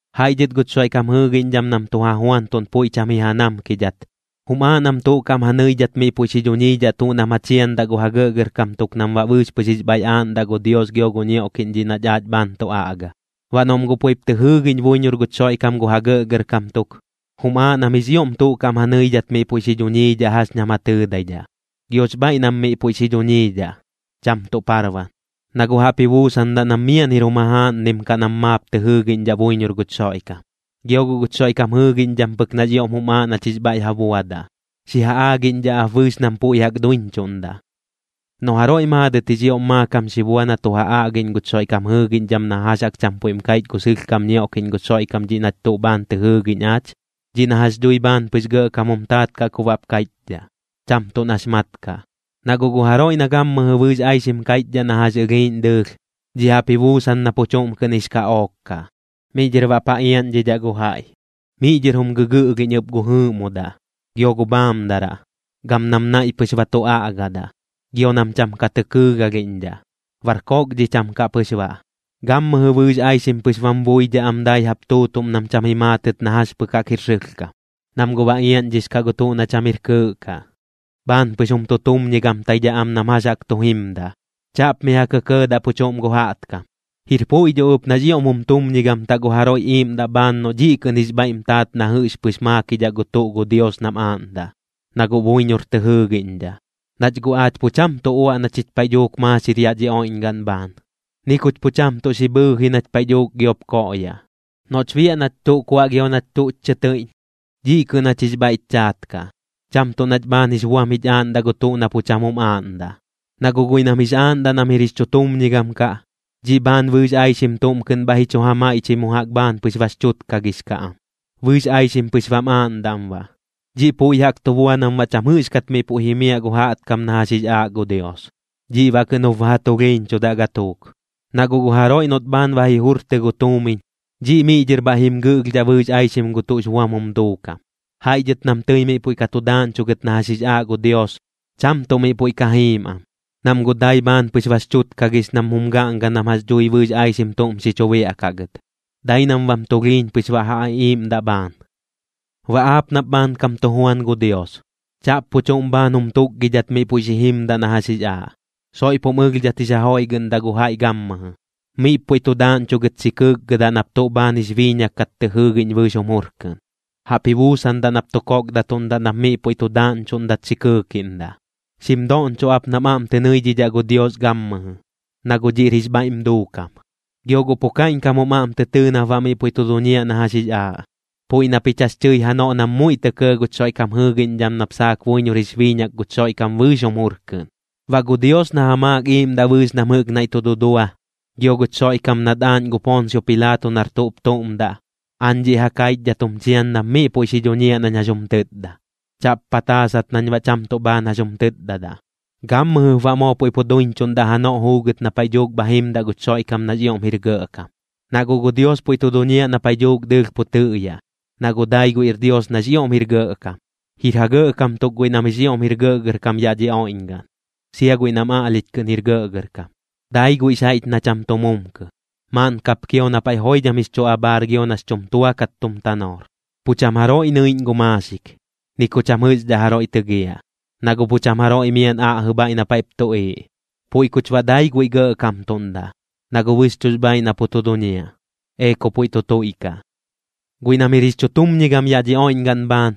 Jaiꞌ dhɨt guch Xoiꞌkam jɨɨgiꞌñdham nam tu ja juantuꞌn puiꞌ cham ji ja namkidhat, jum aaꞌ nam tuꞌ kaꞌm ja nɨidhat miꞌ puiꞌ xi dhuñiidhaꞌ tuꞌ nam ja chiandaꞌ gu ja gɇꞌgɇrkam tuk nam baꞌ bɨɨx pɨx jix bhaiꞌ aaꞌndaꞌ gu Dios gio gu ñioꞌkiꞌñ dhiꞌ nach aach bhaan tu aꞌga. Baꞌ noꞌm guꞌ puiꞌp tɨ jɨɨgiꞌñ buiñor guch Xoiꞌkam gu ja gɇꞌgɇrkam tuk, jum aaꞌ nam jix ioꞌm tuꞌ kaꞌm ja nɨidhat miꞌ puiꞌ xi dhuñiidhaꞌ jax ñam ja tɨɨdaidhaꞌ. Giox bhaiꞌ nam miꞌ puiꞌ xi dhuñiidhaꞌ, cham tuꞌ parban, na guꞌ jaꞌp ji buusandaꞌ nam miaꞌn jir jum jajaaꞌnnim kaꞌ nam maap tɨ jɨɨgiꞌñdhaꞌ buiñor guch Xoiꞌkam. Gio guꞌ guch Xoiꞌkam jɨɨgiꞌñdham pɨk nax ioꞌm jum aaꞌ nach jix bhaiꞌ ja buadaꞌ. Xi ja aagiꞌñdhaꞌ ap bɨɨx nam puiꞌ jaꞌk duiñchuꞌndaꞌ. Noꞌ jaroiꞌ maadɨt jix ioꞌm maakam xi bua na tu ja aꞌgiꞌñ guch Xoiꞌkam jɨɨgiꞌñdham na jax jaꞌk cham puiꞌm kaiꞌch gu sɨlhkam ñioꞌkiꞌñ guch Xoiꞌkam dhiꞌ nach tuꞌ bhaan tɨ jɨɨgiꞌñ aach, dhiꞌ na jax dhui bhaan pɨx gɇꞌkam jum taat kaꞌ ku baꞌp kaiꞌchdhaꞌ, cham tuꞌ nax mat kaꞌ. Na guꞌ gu jaroiꞌ na gammɨjɨ bɨɨx aixim kaiꞌchdhaꞌ na jax ɨlhiiꞌñ dɨɨlh, dhiꞌ jaꞌp ji buusan na pu chuꞌm kɨꞌn jix kaꞌook kaꞌ, miꞌ dhɨr baꞌp ja iaꞌñdhidhaꞌ gu jaiꞌ. Miꞌ dhɨr jum gɨgɨꞌlhiꞌñ ɨp gu jɨɨꞌmodaꞌ, gio gu bhaamdaraꞌ, gam nam naiꞌ pɨx ba tu aꞌgadaꞌ, gio nam cham ka tɨ kɨɨgalhiꞌñdhaꞌ. Bar koꞌkdhicham kaꞌ pɨx baꞌ, gammɨjɨ bɨɨx aixim pɨx bam buidhaꞌ am dai jaꞌp tuutuꞌm nam cham ji maatɨt na jax pɨk jaꞌk jir sɨlhkam. Nam guꞌ bax iaꞌñdhix kaꞌ gu tuꞌ na cham jir kɨɨꞌ kaꞌ, bhaan pɨx jum tutumñigamtaidhaꞌ am nam jax jaꞌk tu jimdaꞌ. Chaꞌp mi ja kɇkɇɇdaꞌ pu chuꞌm gu jaꞌtkam. Jir puiꞌ dho ɨp nax ioꞌm jum tumñigamtaꞌ gu jaroiꞌ iiꞌmdaꞌ bhaan noꞌ dhiꞌ kɨꞌn jix bhaiꞌm taat na jɨꞌx pɨx maakidhaꞌ gu tuꞌ gu Dios nam aaꞌndaꞌ, na guꞌ buiñor tɨ jɨɨgiꞌñdhaꞌ. Nach guꞌ aach pu cham tuꞌ uaꞌ na chich paiꞌ dhuuk maaxir yaꞌ dhi oiꞌñgaꞌn bhaan, ni kuch pu cham tuꞌ xi bhɨi nach paiꞌ dhuuk giop koꞌyaꞌ. Noꞌch biaꞌ nach tuꞌ kuaꞌ gio nach tuꞌch chɨ tɨiꞌñ, dhiꞌ kɨꞌn jach jix bhaiꞌch chaat kaꞌ, cham tuꞌ nach bhaan jix buam jich aaꞌndaꞌ gu tuꞌ na pu cham jum aaꞌndaꞌ. Na guꞌ guiꞌ nam jix aaꞌndaꞌ nam jir jix chutumñigam kaꞌ, dhiꞌ bhaan bɨɨx aixim tuꞌm kɨꞌn bhaiꞌ ji chu ja maiꞌchɨi mu jaꞌk bhaan pɨx bax chutkagix kaꞌ am, bɨɨx aixim pɨx bam aaꞌndaꞌm baꞌ. Dhiꞌ puiꞌ jaꞌk tu bua nam baꞌ cham jɨꞌxkat miꞌ puiꞌ jimiaꞌ gu jaꞌtkam na jax jix aaꞌ gu Dios, dhiꞌ baꞌ kɨꞌn jup ba ja tulhiiñchudaꞌ gatuuk. Na guꞌ gu jaroiꞌ noꞌt bhaan ba ji jurtɨ gu tuumiñ, dhiꞌ miꞌ dhɨr bhaiꞌ jim gɨꞌlhdhaꞌ bɨɨx aixim gu tuꞌx buam jum duukam. Jaiꞌ dhɨt nam tɨi miꞌ puiꞌ ka tu daaꞌñchugɨt na jax jix aaꞌ gu Dios, cham tuꞌ miꞌ puiꞌ ka jiim am, nam guꞌ dai bhaan pɨx bax chutkagix nam jum gaꞌnga nam jax dhui bɨɨx aixim tuꞌm xi chu biaꞌkaꞌ gɨt, dai nam bam tulhiiñ pɨx baꞌ ja iꞌiiꞌmdaꞌ bhaan. Baꞌ aap nap bhaankam tu juan gu Dios, chaꞌp pu chuꞌm bhaan jum tukgidhat miꞌ puiꞌ xi jimdaꞌ na jax jix aaꞌ. Soiꞌp jum ɨlhdhat jix ja joiꞌgɨꞌndaꞌ gu jaiꞌ gammɨjɨ. Miꞌp puiꞌ tu daaꞌñchugɨt xi kɨɨkgɨdaꞌ nap tuꞌ bhaan jix biiñak kat tɨ jɨɨgiꞌñ bɨɨx jum jur kɨꞌn. Jaꞌp ji buusandaꞌ nap tu kokdatuꞌndaꞌ nap miꞌ puiꞌ tu daaꞌñchuꞌndat xi kɨɨkiꞌndaꞌ. Xim doꞌñchoꞌ ap nam aꞌm tɨ nɨidhidhaꞌ gu Dios gammɨjɨ, na guꞌ dhiꞌr jix bhaiꞌm duukam. Gio guꞌ pu kaiꞌñkam jum aꞌm tɨ tɨɨ nap baꞌ miꞌ puiꞌ tu duñiaꞌ na jax jix aaꞌ, puiꞌ na pich jax tɨi janoꞌ nam muiꞌ tɇ kɇɇ guch Xoiꞌkam jɨɨgiꞌñdham nap saak buiñor jix biiñak guch Xoiꞌkam bɨɨx jum jur kɨꞌn. Baꞌ gu Dios na ja maak iiꞌmdaꞌ bɨɨx nam jɨꞌk tuꞌ naiꞌ tu dudua, gio guch Xoiꞌkam nat aaꞌñ gu Poonsio Pilaato nar tuꞌp tuꞌm daꞌ, aañ dhiꞌ ja kaichdhat jum chian nap miꞌ puiꞌ xi dhuñiaꞌ nañ jax jum tɨtda. Chaꞌp pataasat nañ baꞌ cham tuꞌ bhaan jax jum tɨtdadaꞌ. Gammɨjɨp baꞌ moo puiꞌ pu duiñchuꞌndaꞌ janoꞌ juugɨt na paiꞌ dhuuk bha jimdaꞌ guch Xoiꞌkam nax ioꞌm jir gɇꞌkam. Na guꞌ gu Dios puiꞌ tu duñiaꞌ na paiꞌ dhuuk dɨɨlh pu tɨꞌyaꞌ, na guꞌ dai guiꞌr Dios nax ioꞌm jir gɇꞌkam. Jir ja gɇꞌkam tuk guiꞌ nam jix ioꞌm jir gɇꞌgɇrkam yaꞌ dhi oiꞌñgaꞌn, sia guiꞌ nam aꞌlhich kɨꞌn jir gɇꞌgɇrkam. Dai guiꞌx jaiꞌch na cham tu mumkɨ. Maaꞌn kap kio na paiꞌ joidham jix chu abhaar gio nax chum tua kat tum tanoor. Pu cham jaroiꞌ nɨiꞌñ maaxik, ni ku cham jɨꞌxdhaꞌ jaroiꞌ tɨgiaꞌ, na guꞌ pu cham jaroiꞌ miaꞌn aꞌjɨ bhaiꞌ na paiꞌp tuꞌiiꞌ. Puiꞌ kuch baꞌ dai guiꞌ gɇꞌkamtuꞌndaꞌ, na guꞌ bɨxchuꞌx bhaaiꞌ na pu tu duñiaꞌ. Ee ku puiꞌ tu tuiꞌkaꞌ. Guiꞌ nam jir jix chutumñigam yaꞌ dhi oiꞌñgaꞌn bhaan,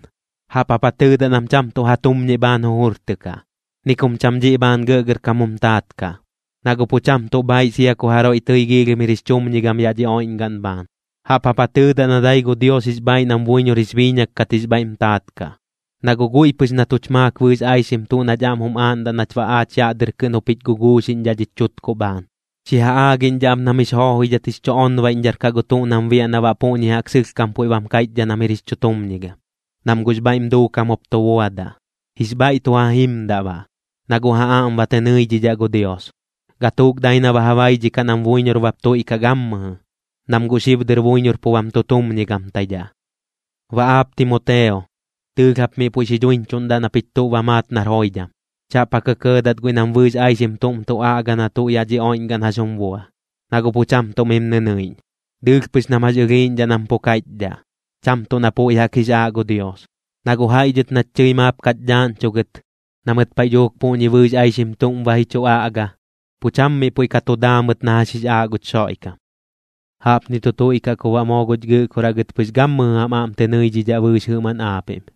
jaꞌp jap ja tɨɨdaꞌ nam cham tuꞌ ja tumñiꞌ bhaan jujurtɨkaꞌ, ni kum cham dhiꞌ bhaan gɇꞌgɇrkam jum taat kaꞌ, na guꞌ pu cham tuꞌ bhaaiꞌ sia ku jaroiꞌ tɨi giilhim jir jix chumñigam yaꞌ dhi oiꞌñgaꞌn bhaan. Jaꞌp jap ja tɨɨdaꞌ na dai gu Dios jix bhaaiꞌ nam buiñor jix biiñak kat jix bhaiꞌm taat kaꞌ, na guꞌ guiꞌ pɨx na tuch maak bɨɨx aixim tuꞌ nach aꞌm jum aaꞌndaꞌ nach baꞌ aach yaꞌ dɨr kɨꞌn jup jich guguuxiꞌñdhaꞌ dhich chutkuꞌ bhaan. Xi ja aagiꞌñdhaꞌ ap nam jix joojoidhat jix chu onbaiꞌñdhar kaꞌ gu tuꞌ nam biaꞌ na baꞌ puꞌñi jaꞌk sɨlhkam puiꞌ bam kaiꞌchdhaꞌ nam jir jix chutumñigam, nam guꞌx bhaiꞌm duukam jup tu buadaꞌ. Jix bhaiꞌ tu ja jimdaꞌ baꞌ, na guꞌ ja aꞌm ba tɨ nɨidhidhaꞌ gu Dios. Gatuuk dai na ba ja baidhikaꞌ nam buiñor bap tuiꞌkaꞌ gammɨjɨ, nam guꞌ xib dɨr buiñor pu bam tutumñigamtaidhaꞌ. Baꞌ aap Timoteo, dɨɨlh jap miꞌ puiꞌ xi dhuiñchuꞌndaꞌ na pich tuꞌ ba maat nar joidham. Chaꞌp ja kɇkɇɇdat guiꞌ nam bɨɨx aixim tuꞌm tu aꞌga na tuꞌ yaꞌ dhi oiꞌñgaꞌn jax jum bua, na guꞌ pu cham tuꞌ mim nɨnɨiꞌñ. Dɨɨlh pɨx nam jax ɨlhiiꞌñdhaꞌ nam pu kaiꞌchdhaꞌ, cham tuꞌ na puiꞌ jaꞌk jix aaꞌ gu Dios. Na guꞌ jaiꞌ dhɨt nach tɨi maap kach dhaaꞌñchugɨt, na mɨt paiꞌ dhuuk puꞌñi bɨɨx aixim tuꞌm ba ji chu aꞌga, pu cham miꞌ puiꞌ ka tu daa mɨt na jax jix aaꞌ guch Xoiꞌkam. Jaꞌpni tu tuiꞌkaꞌ ku baꞌ moo guch Gɨꞌkoraꞌ gɨt pɨx gammɨjɨ jam aꞌm tɨ nɨidhidhaꞌ bɨɨx jɨꞌmaꞌn aapiꞌm.